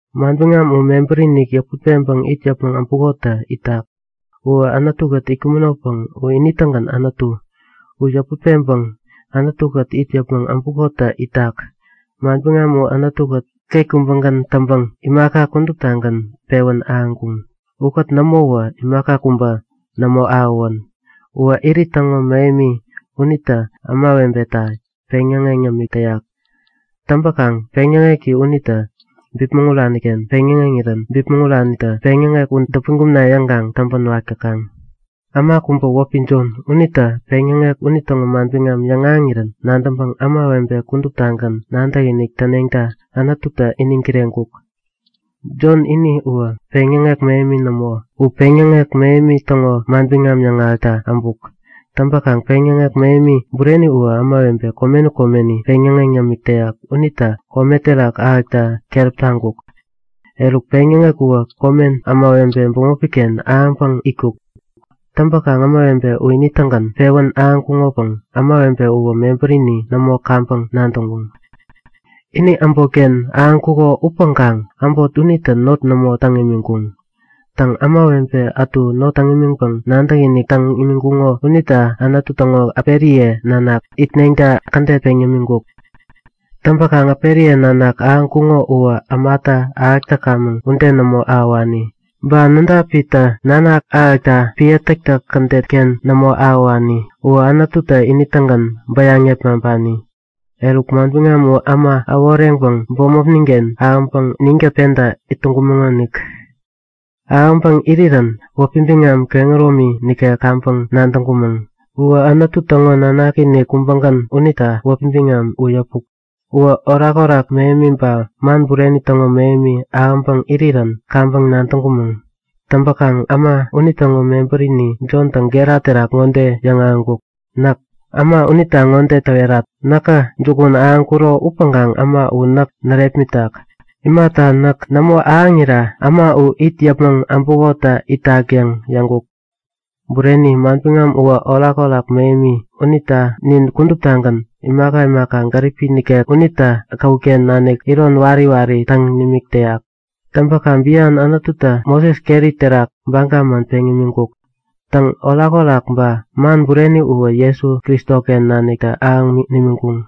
Manbiŋam U mebäri-ken-inik yäput peŋpäŋ it yäpmäŋ äbukotä itak. Uwä Anutu-kät itkumänopäŋ u ini-tägän Anutu. U yäput peŋpäŋ Anutu-kät it yäpmäŋ äbukotä itak. Manbiŋam U Anutu-kät ket kubägän täŋpäŋ imaka kuduptagän pewän ahäŋkuŋ. Ukät nämowä imaka kubä nämo ahäwän. Uwä irit täŋo mähemi unitä ämawebeta peŋyäŋeŋ yämik täyak. Täŋpäkaŋ peŋyäŋeki unitä bipmäŋ urani-ken peŋyäŋeŋirän bipmäŋ uranitä peŋyäŋek u däpän kumna yäŋkaŋ täŋpän wak täkaŋ. Äma kubä wäpi Jon. Unitä peŋyäŋek unitäŋo manbiŋam yäŋahäŋirän nadäŋpäŋ ämawebe kuduptagän nadäkinik täneŋta Anututä iniŋ kireŋkuk. Jon ini uwä peŋyäŋek mähemi nämo. U peŋyäŋek mähemi täŋo manbiŋam yäŋahäkta äbuk. Täŋpäkaŋ peŋyäŋek mähemi bureni uwä ämawebe komeni komeni peŋyäŋeŋ yämik täyak unitä kome terak ahäkta keräp taŋkuk. Eruk peŋyäŋek uwä komen ämawebe bämopi-ken ahäŋpäŋ itkuk. Täŋpäkaŋ ämawebe u ini-tägän pewän ahäŋkuŋopäŋ ämawebe uwä mebärini nämo kaŋpäŋ nadäŋkuŋ. Ini äbotken ahäŋkuko upäŋkaŋ äbot unitä not nämo täŋ imiŋkuŋ. Täŋ, ämawebe ätu not täŋ imiŋpäŋ nadäkinik täŋ imiŋkuŋo unita Anutu täŋo äperiye nanak itneŋta kädet peŋ yämiŋkuk. Täŋpäkaŋ äperiye nanak ahäŋkuŋo uwä ämatä ahäk täkamäŋ ude nämo ahäwani. Ba nädapitä nanak ahäkta epän täktäk kädet-ken nämo ahäwani. Uwä Anututä ini-tägän bäyaŋ yepmaŋpani. Eruk, Manbiŋam u äma äworeŋpäŋ bämopnin-ken ahäŋpäŋ ninkät penta it täŋkumäŋonik. Ahäŋpäŋ irirän wäpi biŋam kehäromi nikek kaŋpäŋ nadäŋkumäŋ. Uwä Anutu täŋo nanaki-inik kubägän unita wäpi biŋam u yäpuk. Uwä orakorak mähemi ba man bureni täŋo mähemi ahäŋpäŋ irirän kaŋpäŋ nadäŋkumäŋ. Täŋpäkaŋ äma unitäŋo mebärini Jontä gera terak ŋode yäŋahäŋkuk; Näk äma unita ŋode täwerat; Näkä jukun ahäŋkuro upäŋkaŋ äma u näk närepmitak. Imata, näk nämo ahäŋira äma u it yäpmäŋ äbukotä itak yäŋ yäŋkuk. Bureni! Manbiŋam uwä orakorak mähemi. Unita nin kuduptagän imaka imaka gäripi nikek unitä käwut-ken nanik iron wari wari täŋ nimik täyak. Täŋpäkaŋ bian Anututä Moses keri terak baga man peŋ nimiŋkuk. Täŋ, orakorak ba man bureni uwä Jesu Kristoken naniktä ahäŋ nimiŋkuŋ.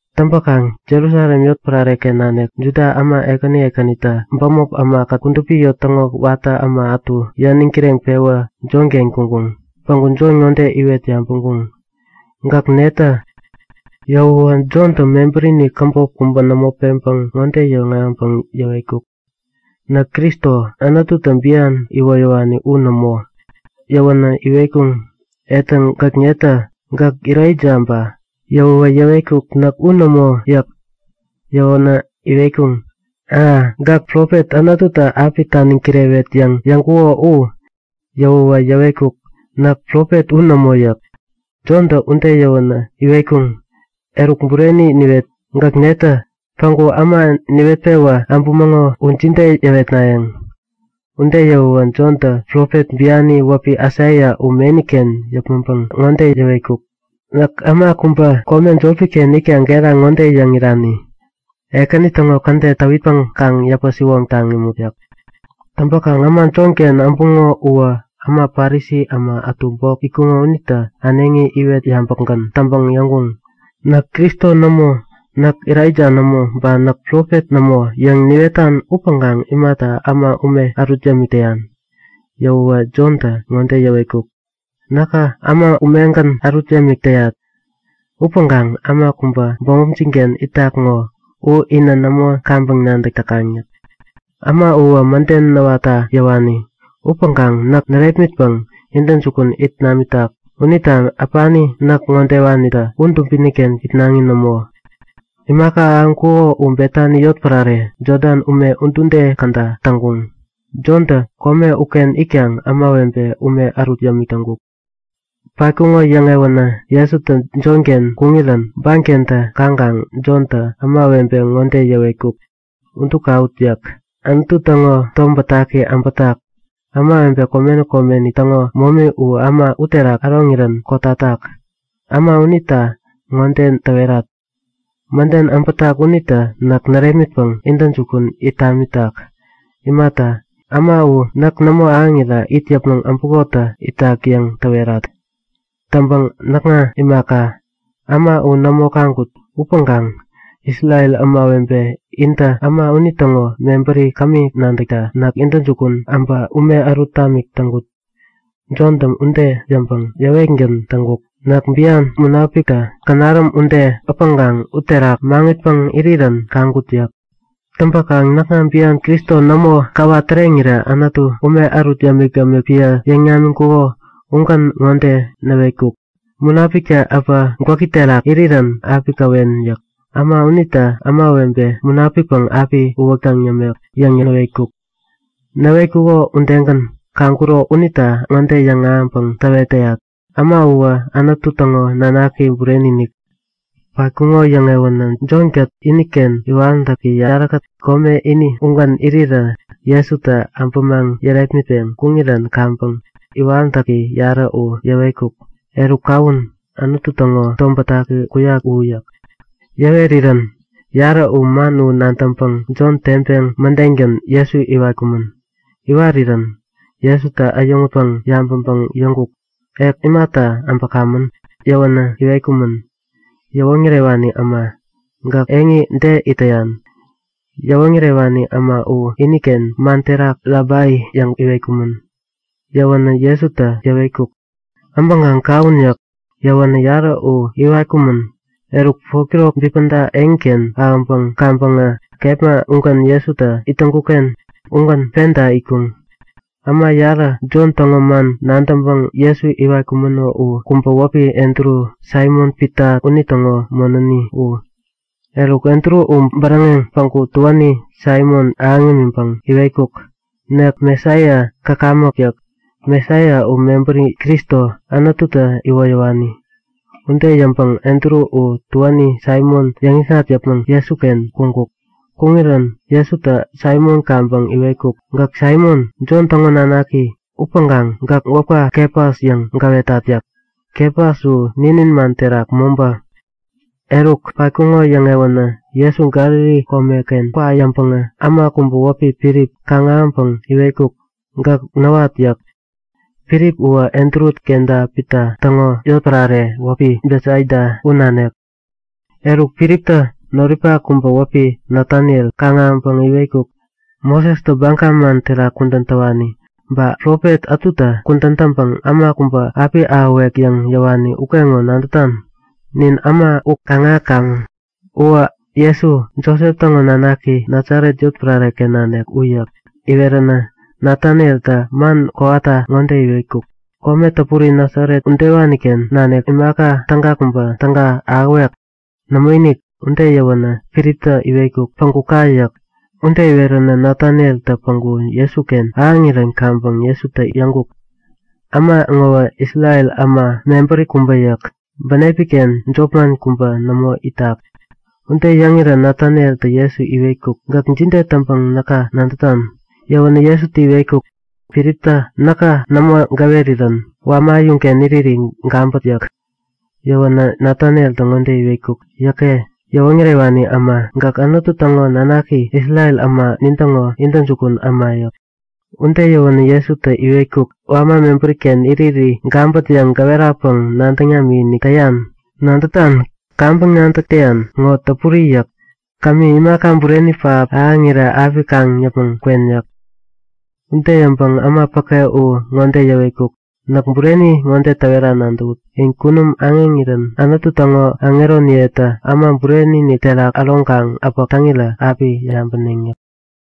Täŋpäkaŋ Jerusalem yotpärare-ken nanik Juda äma ekäni ekänitä bämop ämakät kudupi eŋi täŋo watä äma ätu yäniŋ kireŋpewä Jonken kuŋkuŋ. Päŋku Jon ŋode iwet yabäŋkuŋ; Gäk netä? Yäwäwä Jontä mebärini käbop kubä nämo peŋpäŋ ŋode yäŋahäŋpäŋ yäwetkuk; Näk Kristo, Anututä bian iwoyäwani u nämo! Yäwänä iwetkuŋ; Etäŋ, gäk netä? Gäk Elaija ba? Yäwäwä yäwetkuk; Näk u nämo! yäk. Yäwänä iwetkuŋ; A, Gäk profet, Anututä api taniŋ kirewet yäŋ yäŋkuko u? Yäwäwä yäwetkuk; Näk profet u nämo yäk. Jontä ude yäwänä iwetkuŋ; Eruk bureni niwet! Gäk netä? Päŋku äma niwet-pewä äbämäŋo u jide yäwetnayäŋ? Ude yäwäwä Jontä profet biani wäpi Aisaia u meni-ken yäpmäŋpäŋ ŋode yäwetkuk; Näk äma kubä, kome jopi-ken itkaŋ gera ŋode yäŋ irani; Ekäni täŋo kädet täwitpäŋ kaŋ yäpä-siwoŋtaŋ imut! yäk. Täŋpäkaŋ äma Jonken äbuŋo uwä äma Parisi äma ätu bok itkuŋo unitä äneŋi iwet yabäkgän täŋpäŋ yäŋkuŋ; Näk Kristo nämo, Näk Elaija nämo ba Näk profet nämo yäŋ niwetan upäŋkaŋ imata äma ume ärut yämik täyan? Yäwäwä Jontä ŋode yäwetkuk; Näkä äma umegän ärut yämik täyat. Upäŋkaŋ äma kubä bämopjin-ken itak ŋo, u inä nämo kaŋpäŋ nadäk täkaŋ yäk. Äma uwä mäden näwatta yäwani. Upäŋkaŋ näk närepmitpäŋ intäjukun it namitak unita äpani näk ŋodewanitä u dubini-ken itnaŋi nämo. Imaka ahäŋkuko u Betani yotpärare, Jodan ume udude käda täŋkuŋ. Jontä kome uken itkaŋ ämawebe ume ärut yämik täŋkuk. Patkuŋo yäŋewänä Jesu Jonken kuŋirän bankentä kaŋkaŋ Jontä ämawebe ŋode yäwetkuk; Udu kawut! yäk. Anutu täŋo tom bätaki äbätak! Ämawebe komeni komeni täŋo momi u äma uterak äroŋirän kotatak. Äma unita ŋode täwerat; Mäden äbätak unitä näk närepmitpäŋ intäjukun it namitak. Imata, äma u näk nämo ahäŋira it yäpmäŋ äbukotä itak yäŋ täwerat. Täŋpäŋ näkŋa imaka, äma u nämo kaŋkut. Upäŋkaŋ Isrel ämawebe intä äma unitäŋo mebäri kämi nadäkta näk intäjukun äbä ume ärut tamik täŋkut. Jontä ude yäŋpäŋ yäwetgän täŋkuk; Näk bian Munapiktä känaräm ude äpäŋkaŋ uterak maŋitpäŋ irirän kaŋkut yäk. Täŋpäkaŋ näkŋa bian Kristo nämo käwa täreŋirä Anutu, ume ärut yämik-yämik epän yäŋ namiŋkuko ugän ŋode näwetkuk; Munapiktä äpä gwäki terak irirän api käwen yäk. Äma unitä ämawebe Munapikpäŋ api uwäktäŋ yämek yäŋ näwetkuk. Näwetkuko udegän kaŋkuro unita ŋode yäŋahäŋpäŋ täwet täyat; Äma uwä Anutu täŋo nanaki bureni-inik. Patkuŋo yäŋewänä Jon-kät iniken iwaräntäki yarä kome ini ugän irirä Jesutä äbämaŋ yärepmitpeŋ kuŋirän kaŋpäŋ iwaräntäki yarä u yäwetkuk; Eruk kawun! Anutu täŋo tom bätaki kuyak u yäk. Yäwerirän yarä u man u nadäŋpäŋ Jon teŋpeŋ mädengän Jesu iwatkumän. Iwarirän Jesutä äyäŋutpäŋ yabäŋpäŋ yäŋkuk; Ek imata äbäkamän? Yäwänä iwetkumän; Yäwoŋärewani äma! Gäk eŋi de it täyan? (Yäwoŋärewani äma u iniken man terak Rabai yäŋ iwetkumän.) Yäwänä Jesutä yäwetkuk; Äbäŋkaŋ kawun! yäk. Yäwänä yarä uwä iwatkumän. Eruk 4'kirok bipäda eŋiken ahäŋpäŋ kaŋpäŋä kepma ugän Jesutä it täŋkuk-ken ugän penta itkuŋ. Äma yarä, Jon täŋo man nadäŋpäŋ Jesu iwatkumäno u kubä wäpi Andru, Saimon-Pita unitäŋo monäni u. Eruk Andru u bäräŋeŋ päŋku tuäni Saimon ahäŋ imiŋpäŋ iwetkuk; Nek Mesaia käkamäk yäk. (Mesaia u mebäri Kristo, Anututä iwoyäwani.) Ude yäŋpäŋ Andru u tuäni Saimon yäŋikŋat yäpmäŋ Jesuken kuŋkuk. Kuŋirän Jesutä Saimon kaŋpäŋ iwetkuk; Gäk Saimon, Jon täŋo nanaki. Upäŋkaŋ gäk wäpka Kefas yäŋ gäwetat yäk. (Kefas u ninin man terak mobä.) Eruk, patkuŋo yäŋewänä Jesu Galili komeken kwa yäŋpäŋä äma kubä wäpi Filip kaŋ-ahäŋpäŋ iwetkuk; Gäk näwat! yäk. Filip uwä Andru kenta Pita täŋo yotpärare wäpi Betsaida, u nanik. Eruk, Filiptä noripak kubä wäpi Nataniel kaŋ-ahäŋpäŋ iwetkuk; Mosestä baga man terak kudän täwani, ba profet ätutä kudän täŋpäŋ Äma kubä api ahäwek yäŋ yäwani ukeŋo nadätan? Nin äma u kaŋ-ahäkamäŋ. Uwä Jesu, Josep täŋo nanaki, Nasaret yotpärare-ken nanik u yäk. Iweränä Natanieltä man kowata ŋode iwetkuk; Kome täpuri Nasaret udewani-ken nanik imaka täga kubä täga ahäwek? Nämoinik! Ude yäwänä Filiptä iwetkuk; Päŋku ka! yäk. Ude iweränä Natanieltä päŋku Jesuken ahäŋirän kaŋpäŋ Jesutä yäŋkuk; Äma ŋowä Isrel äma mebäri kubä yäk. Bänepi-ken jopman kubä nämo itak. Ude yäŋirän Natanieltä Jesu iwetkuk; Gäk jide täŋpäŋ näka nadätan? Yäwänä Jesutä iwetkuk; Filiptä näka nämo gäwerirän wama äyuŋken iriri gabät yäk. Yäwänä Natanieltä ŋode iwetkuk; Yäke! Yäwoŋärewani äma, gäk Anutu täŋo nanaki, Isrel äma nintäŋo intäjukun äma yäk. Ude yäwänä Jesutä iwetkuk; Wama mebäri-ken iriri gabät yäŋ gäwerapäŋ nadäŋ namikinik täyan? Nadätan, kaŋpäŋ nadäk täyan ŋo täpuri yäk. Kämi, imaka bureni pähap ahäŋirä api kaŋ yäpmäŋ kwen yäk. Ude yäŋpäŋ äma päke u ŋode yäwetkuk; Näk bureni ŋode täwera nadäwut; In kunum aŋeŋirän Anutu täŋo aŋeroniyetä Äma Bureni-inik terak äroŋkaŋ äpäk täŋirä api yabäneŋ yäk.